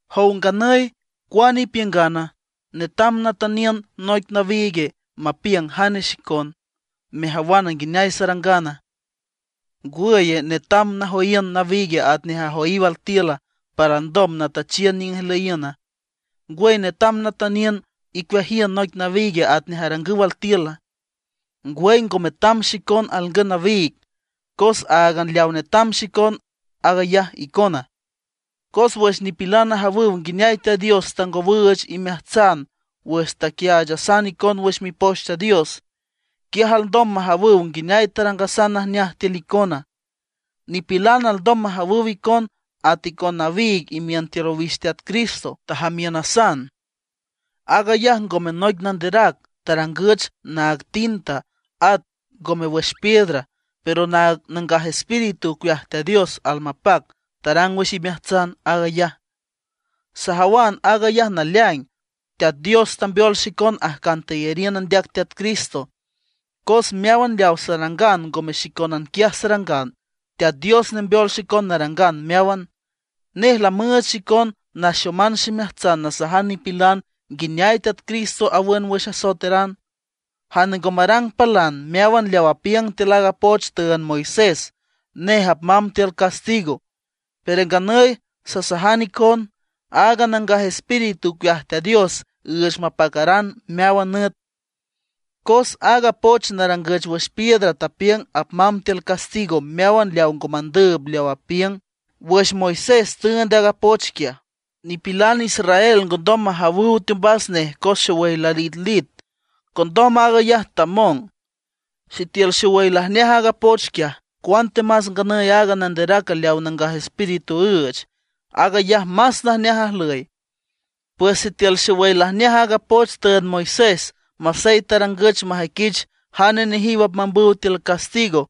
Jow nganüy, ¿cuane ipiüngana? ¿Netam natüniün noic nawiig mapiüng jane xicon, mejawan nguineay sarangana? ¿Ngwüye, netam najoyiün nawiig atnej ajoyiw altiül, para alndom natüchiün niüng ijlüyiüna? ¿Ngwüy netam natüniün icueajiün noic nawiig atnej arangüw altiüla? Ngwüy, ngo metam xicon alngün nawiig; cos áagan leaw netam xicon, aag ayaj icona. Cos wüx nipilan ajawüw nguineay Teat Dios tangowüüch imeajtsan wüx taquiaachasan icon wüx Mipoch Teat Dios, quiaj alndom majawüw nguineay tarangasan najneaj tiül icona. Nipilan alndom majawüw icon at icon nawiig imiün tiül owix Teat Cristo, tajamiünasan. Aag ayaj ngome noic nanderac tarangüch naag tinta, at ngome wüx piedra; pero Nangaj Espíritu ocueaj Teat Dios almapac tarang wüx imeajtsan aag ayaj. Sajawan aag ayaj naleaing, Teat Dios tambeol xicon ajcan teyariün andeac Teat Cristo. Meáwan leaw sarangan ngome xicónan quiaj sarangan, Teat Dios nembeol xicon narangan meáwan. Nej lamüüch xicon naxoman ximeajtsan nasajan nipilan nguineay Teat Cristo awün wüx asoeteran. Jane ngo marang palan meáwan leaw apiüng tiül aaga poch tüünd Moisés, nej apmamb tiül castigo. Pero nganüy sasajan icon, aaga Nangaj Espíritu ocueaj Teat Dios üüch mapacaran meáwan nüt. Cos aaga poch narangüch wüx piedra tapiüng apmamb tiül castigo meáwan leaw ngo mandüüb leaw apiüng. Wüx Moisés tüünd aaga poch quiaj, nipilan Israel ngondom majawüw teombas nej cos xowüy lalitlit, condom aag ayaj tamong. Sitiül xowüy lajneaj aaga poch quiaj, cuantemas nganüy aaga nanderac leaw Nangaj Espíritu üüch, aag ayaj más najneaj ajlüy. Pues sitiül xowüy lajneaj aaga poch tüünd Moisés, masey tarangüch majüiquich jane nejiw apmambüw tiül castigo,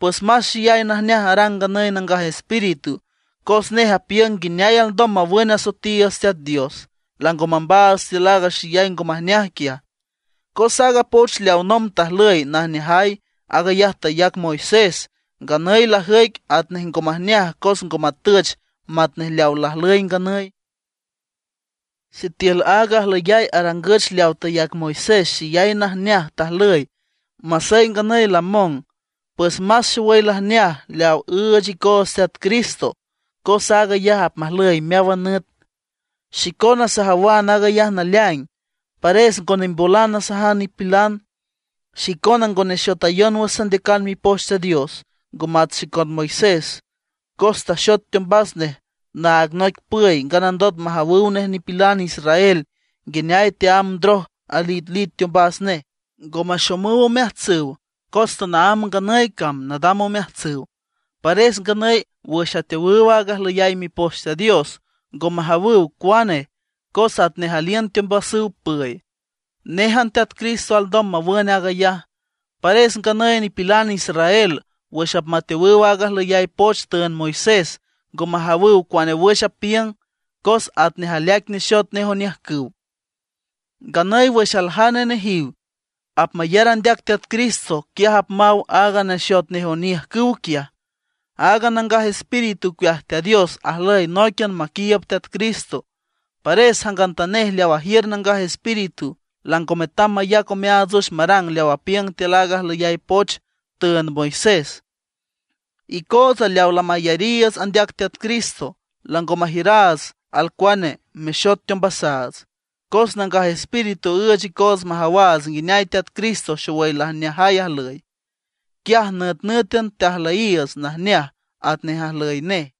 pues más xeyay najneaj arang nganüy Nangaj Espíritu, cos nej apiüng nguineay alndom mawün asoetiiüts Teat Dios, lango mambaats tiül aaga xeyay ngo majneaj quiaj. Cos aaga poch leaw nomb tajlüy najneajay, aag ayaj tayac Moisés, nganüy lajüic atnej ngo majneaj cos ngo matüch matnej leaw lajlüy nganüy. Sitiül aaga ajlüyay arangüch leaw tayac Moisés xeyay najneaj tajlüy, masey nganüy lamong, pues más xowüy lajneaj leaw tüüch icoots Teat Cristo cos aag ayaj apmajlüy meáwan nüt. Xicona sajawan aag ayaj naleaing, pares ngo nimbolan nasajan nipilan. Xicona ngo nexotayon wüx sandeacan Mipoch Teat Dios, ngo mat xicon Moisés, cos taxot teombas nej naag noic püy nganandot majawüw nej nipilan israel nguineay teámb ndroj alitlit teombas nej. Ngo maxomüw omeajtsüw cos tanaámb nganüy cam nadam omeajtsüw. Pares nganüy wüx ateowüw aaga ajlüyay Mipoch Teat Dios, ngo majawüw cuane, cos atnej aliün teombasüw püy. Néjan Teat Cristo alndom mawün aag ayaj. Pares nganüy nipilan israel wüx apmateowüw aaga ajlüyay poch tüünd Moisés, ngo majawüw cuane wüx apiüng, cos atnej aleaic nexot nej oniüjcüw. Nganüy wüx aljane nejiw apmayar andeac Teat Cristo, quiaj apmaw aaga nexot nej oniüjcüw quiaj. Aaga Nangaj Espíritu ocueaj Teat Dios ajlüy nóiquian maquiiüb Teat Cristo. Pares jangantanej leaw ajiür Nangaj Espíritu lango metam mayac omeaats wüx marang leaw apiüng tiül aaga ajlüyay poch tüünd Moisés. Icootsa leaw lamayariiüts andeac Teat Cristo lango majiüraats alcuane mexot teombasaats; cos Nangaj Espíritu üüch icoots majawaats nguineay Teat Cristo xowüy lajneajay ajlüy. Quiaj nütnǘtan teajlüyiiüts najneaj atnej ajlüy nej.